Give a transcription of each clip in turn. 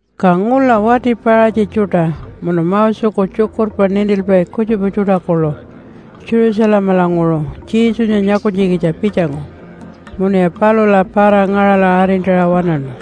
Ka ngula wati Paṟatji tjuṯa munu Moseku tjukurpa nintilpai kutjupa tjuṯa kuḻu Jerusalemalanguṟu Jesunya nyakunytjikitja pitjangu, munuya palula para-ngaṟala arintaṟa waṉaṉu.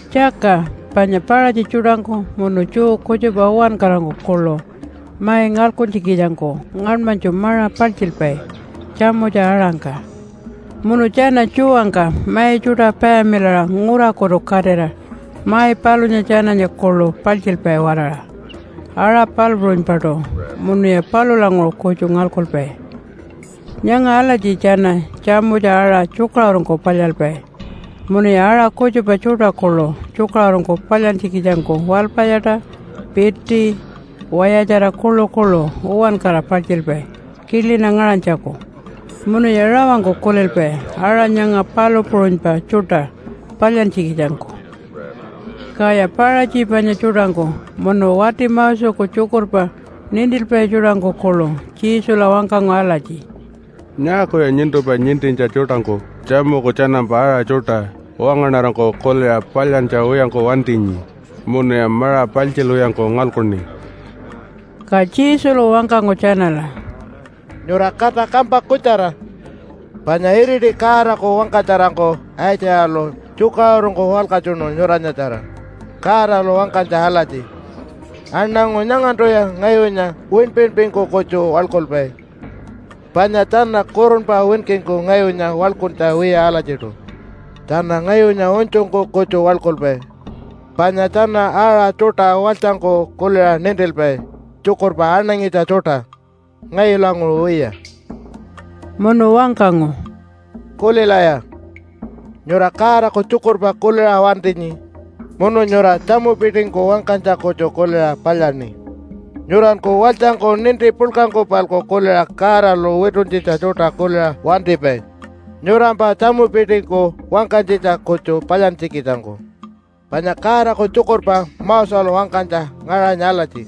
(Tjaka panya Paṟatji tjuṯangku munu Jew kutjupa uwankarangku kuḻu mai ngalkuntjikitjangku ngaṉmanytju maṟa paltjilpai tjamutja-aṟangka. Munu tjana tjuwangka mai tjuṯa payamilaṟa ngurakutu katira mai palunya tjananya kuḻu paḻtjilpai-waraṟa aṟa palu puṟunypaṯu munuya palulanguṟu kutju ngalkupai. Nyanga alatji tjana tjamutja aṟa tjukaṟurungku palyalpai, munuya aṟa kutjupa tjuṯa kuḻu tjukaṟurungku palyantjikitjangku walpayaṯa, piti, wayatjara kuḻukuḻu uwankara paltjilpai kilina ngaṟanytjaku. Munuya rawangku kulilpai aṟa nyanga palu puṟunypa tjuṯa palyantjikitjangku.) Kaya Paṟatji panya tjuṯangku munu wati Moseku tjukurpa nintilpai tjuṯangku kuḻu Jesula wangkangu alatji, “Nyaakuya nyuntumpa nintintja tjuṯangku tjamuku tjanampa aṟa tjuṯa wangaṉarangku kuliṟa palyantja wiyangku wantinyi munuya maṟa paltjilwiyangku ngalkuni?” Ka Jesulu wangkangu tjanala, “Nyura kata kampa kutjara. Panya iriti Godaku wangkatjarangku Aitjayalu tjukaṟurungku walkatjunu nyuranyatjara Godalu wangkanytja alatji, ‘Aṉangu nyangantuya ngayunya winpinpingku kutju waḻkulpai, panya tjana kurunpa winkingku ngayunya waḻkuntja wiya alatjiṯu. Tjana ngayunya unytjungku kutju waḻkulpai. Panya tjana aṟa tjuṯa walytjangku kuliṟa nintilpai tjukurpa aṉangitja tjuṯa, ngayulanguṟu wiya.’” Munu wangkangu, “Kulilaya. Nyura Godaku tjukurpa kuliṟa wantinyi, munu nyura tjamupitingku wangkanytja kutju kuliṟa palyaṉi. Nyuranku walytjangku ninti puḻkangku-palku kuliṟa Godalu wituntjitja tjuṯa kuliṟa wantipai nyurampa tjamupitingku wangkanytjitja kutju palyantjikitjangku. Panya Godaku tjukurpa Moselu wangkanytja ngaṟanyi alatji,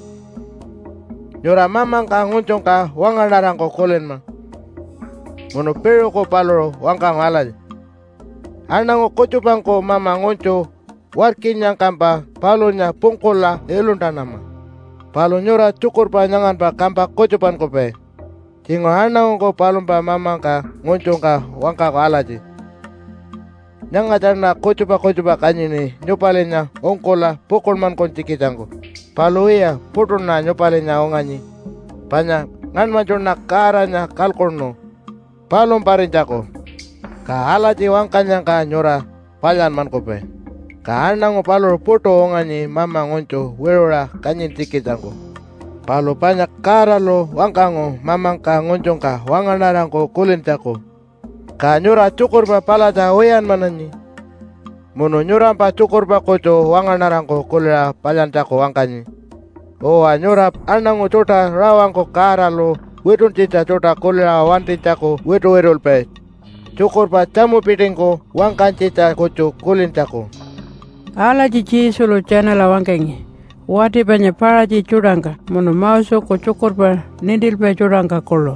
‘Nyura mamangka ngunytjungka wangaṉarangku kulinma.’ Munu piṟuku paluṟu wangkangu alatji, ‘Aṉangu kutjupangku mama ngunytju warkinyangkampa palunya pungkula iluntanama.’ Palu nyura tjukurpa nyanganpa kampa kutjupankupai. Tjinguṟu aṉangungku palumpa mamangka ngunytjungka wangkaku alatji, ‘Nyangatjaṉa kutjupa kutjupa kanyini nyupalinya ungkula pukuḻmankunytjikitjangku, palu wiya, puṯuṉa nyupalinya unganyi panya ngaṉmanytjuṉa Godanya kalkuṉu palumparinytjaku.’ Ka alatji wangkanyangka nyura palyanmankupai, ka aṉangu paluṟu puṯu unganyi mama ngunytju wiṟuṟa kanyintjikitjangku. Palu panya Godalu wangkangu mamangka ngunytjungka wangaṉarangku kulintjaku, ka nyura tjukurpa palatja wiyanmananyi munu nyurampa tjukurpa kutju wangaṉarangku kuliṟa palyantjaku wangkanyi. Uwa, nyura aṉangu tjuṯa rawangku Godalu wituntjitja tjuṯa kuliṟa wantinytjaku wituwitulpai tjukurpa tjamupitingku wangkanytjitja kutju kulintjaku.” Alatji Jesulu tjanala wangkangi wati panya Paṟatji tjuṯangka munu Moseku tjukurpa nintilpai tjuṯangka kuḻu.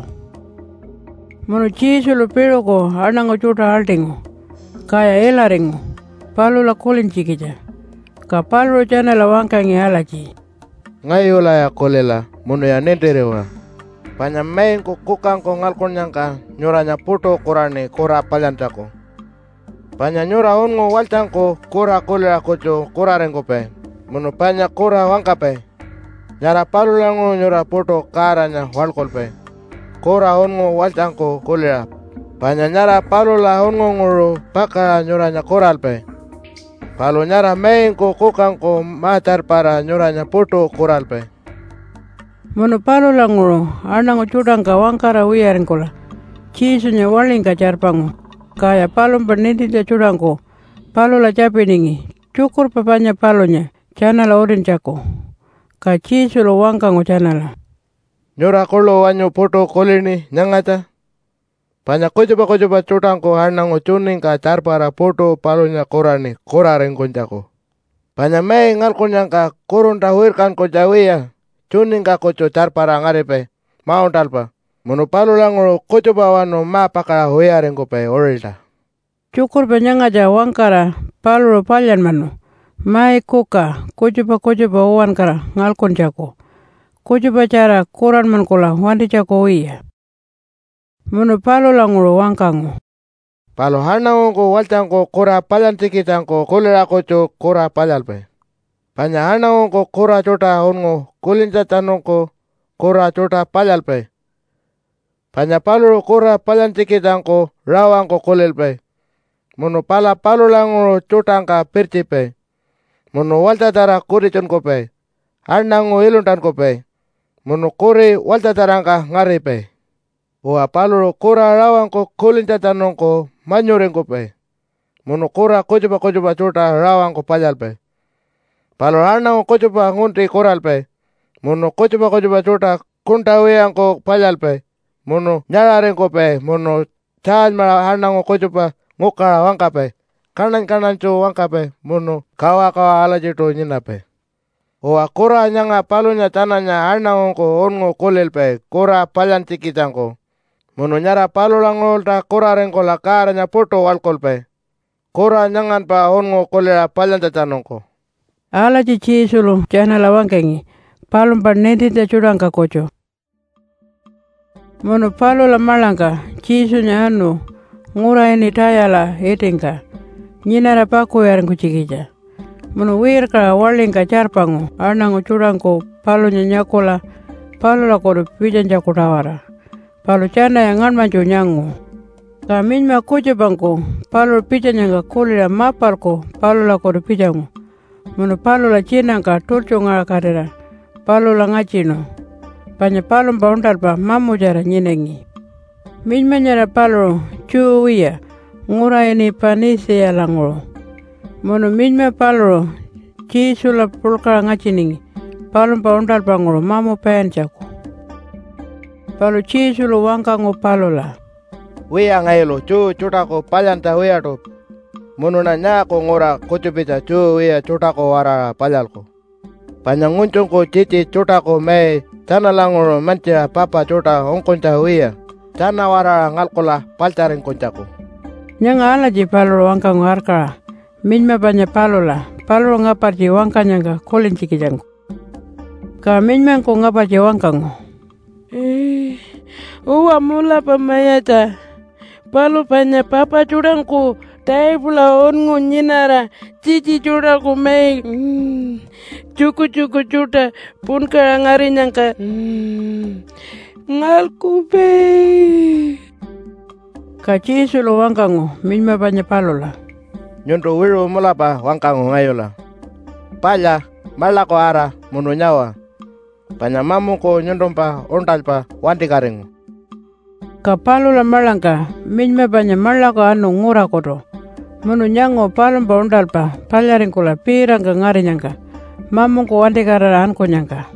Munu Jesulu piṟuku aṉangu tjuṯa aḻṯingu, kaya ilaringu palula kulintjikitja. Ka paluṟu tjanala wangkangi alatji, “Ngayulaya kulila munuya nintiriwa! Panya maingku kukangku ngalkunnyangka nyuranya puṯu kuraṉi kura palyantjaku. Panya nyura unngu walytjangku kura kuliṟa kutju kuraringkupai munu panya kura wangkapai. Nyara palulanguṟu nyura puṯu Godanya waḻkulpai, kura unngu walytjangku kuliṟa, panya nyara palula unngunguṟu pakaṟa nyuranya kuralpai. Palu nyara maingku kukangku ma-tjarpara nyuranya puṯu kuralpai.” Munu palulanguṟu aṉangu tjuṯangka wangkara wiyaringkula Jesunya waḻingka tjarpangu. Kaya palumpa nintintja tjuṯangku palula tjapiningi tjukurpa panya palunya tjanala utintjaku. Ka Jesulu wangkangu tjanala, “Nyura kuḻu wanyu puṯu kulini nyangatja? Panya kutjupa kutjupa tjuṯangku aṉangu tjuningka tjarpara puṯu palunya kuraṉi kuraringkunytjaku. Panya mai ngalkunnyangka kurunta wirkankunytja wiya tjuningka kutju tjarpara ngaripai mauṉṯalpa munu palulanguṟu kutjupawanu ma-pakaṟa wiyaringkupai uṟilta.” (Tjukurpa nyangatja wangkara paluṟu palyanmanu mai kuka kutjupa kutjupa uwankara ngalkuntjaku kutjupatjara kuranmankula wantinytjaku wiya.) Munu palulanguṟu wangkangu, “Palu aṉangungku walytjangku kura palyantjikitjangku kuliṟa kutju kura palyalpai. Panya aṉangungku kura tjuṯa unngu kulintjatjanungku kura tjuṯa palyalpai, panya paluṟu kura palyantjikitjangku rawangku kulilpai, munu pala palulanguṟu tjuṯangka pirtjipai, munu walytjatjara kutitjunkupai, aṉangu iluntankupai, munu kuri walytjatjarangka ngaripai. Uwa, paluṟu kura rawangku kulintjatjanungku manyuringkupai, munu kura kutjupa kutjupa tjuṯa rawangku palyalpai. Paluṟu aṉangu kutjupa ngunti kuralpai, munu kutjupa kutjupa tjuṯa kuṉṯa wiyangku palyalpai munu nyaṟaringkupai munu tjaalymaṟa aṉangu kutjupa ngukaṟa wangkapai, kaṉany-kaṉanytju wangkapai, munu kawakawa alatjiṯu nyinapai. Uwa, kura nyanga palunya tjananya aṉangungku unngu kulilpai kura palyantjikitjangku munu nyara palulanguṟulta kuraringkula Godanya puṯu waḻkulpai kura nyanganpa unngu kuliṟa palyantjatjanungku.” Alatji Jesulu tjanala wangkangi palumpa nintintja tjuṯangka kutju. Munu palula maḻangka Jesunya anu ngura ini Tayala itingka nyinara pakuwiyaringkunytjikitja munu wirkaṟa waḻingka tjarpangu aṉangu tjuṯangku palunya nyakula palulakutu pitjanytjaku-tawara. Palu tjanaya ngaṉmanytju nyangu. Ka minyma kutjupangku paluṟu pitjanyangka kuliṟa mapalku palulakutu pitjangu munu palula tjinangka tultjungaṟakatira palula ngatjinu, panya palumpa uṉṯalpa mamutjara nyinangi. Minyma nyara paluṟu Jew wiya ngura ini Panitjiyalanguṟu. Munu minyma paluṟu Jesula puḻkaṟa ngatjiningi palumpa uṉṯalpanguṟu mamu paintjaku. Palu Jesulu wangkangu palula, “Wiya ngayulu Jew tjuṯaku palyantja wiyaṯu, munuṉa nyaaku ngura kutjupitja Jew wiya tjuṯaku-waraṟa palyalku? Panya ngunytjungku tjitji tjuṯaku mai tjanalanguṟu mantjiṟa papa tjuṯa ungkunytja wiya tjana-waraṟa ngalkula paḻtjaringkunytjaku.” Nyanga alatji paluṟu wangkangu arkaṟa minyma panya palula paluṟu ngapartji wangkanyangka kulintjikitjangku. Ka minymangku ngapartji wangkangu, “Uwa mulapa mayatja, palu panya papa tjuṯangku taipula unngu nyinara tjitji tjuṯaku mai tjukutjuku tjuṯa punkaṟa ngarinyangka ngalkupai.” Ka Jesulu wangkangu minyma panya palula, “Nyuntu wiṟu mulapa wangkangu ngayula. Palya maḻaku ara munu nyawa, panya mamungku nyuntumpa uṉṯalpa wantikatingu.” Ka palula maḻangka minyma panya maḻaku anu ngurakutu munu nyangu palumpa uṉṯalpa palyaringkula piitangka ngarinyangka mamungku wantikatira ankunyangka.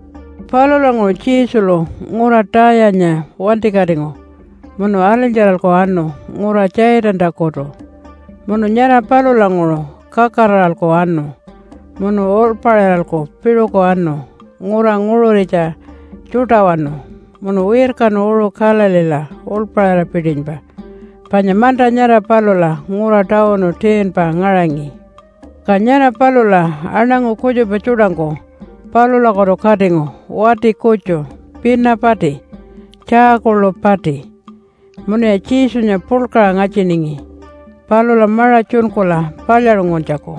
Palulanguṟu Jesulu ngura Tayanya wantikatingu munu alinytjaralku anu ngura Tjaitantakutu munu nyara palulanguṟu kakaraṟa anu munu uḻpaṟiralku piṟuku anu ngura nguṟuritja tjuṯawanu munu wirkanu uṟu Galileela uḻpaṟira-pitinypa panya manta nyara palula ngura tawunu 10-pa ngaṟangi. Ka nyara palula aṉangu kutjupa tjuṯangku palulakutu katingu wati kutju pina pati, tjaa kuḻu pati. Munuya Jesunya puḻkaṟa ngatjiningi palula maṟa tjunkula palyaṟunguntjaku.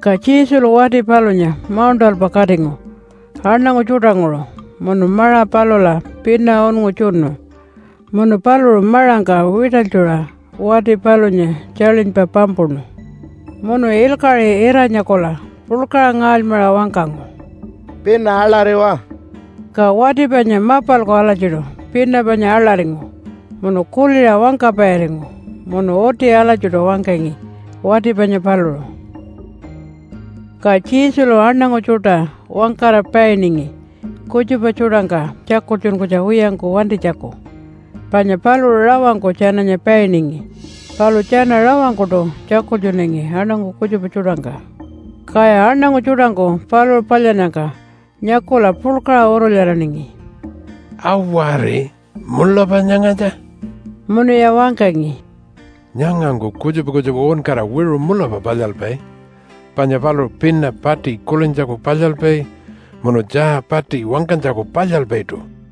Ka Jesulu wati palunya mauṉṯalpa katingu aṉangu tjuṯanguṟu munu maṟa palula pina unngu tjunu, munu paluṟu maṟangka wiṯalytjuṟa wati palunya tjaḻinypa pampuṉu. Munu ilkaṟi ira-nyakula puḻkaṟa ngaalymaṟa wangkangu, “Pina aḻariwa.” Ka wati panya mapalku alatjiṯu pina panya aḻaringu munu kuliṟa wangkapairingu, munu uti alatjiṯu wangkangi wati panya paluṟu. Ka Jesulu aṉangu tjuṯa wangkara painingi kutjupa tjuṯangka tjakultjunkunytja wiyangku wantinytjaku. Panya paluṟu rawangku tjananya painingi, palu tjana rawangkuṯu tjakultjunangi aṉangu kutjupa tjuṯangka. Kaya aṉangu tjuṯangku paluṟu palyannyangka nyakula puḻkaṟa urulyaraningi, “Awari, mulapa nyangatja.” Munuya wangkangi, “Nyangangku kutjupa kutjupa uwankara wiṟu mulapa palyalpai, panya paluṟu pina pati kulintjaku palyalpai munu tjaa pati wangkanytjaku palyalpaiṯu.”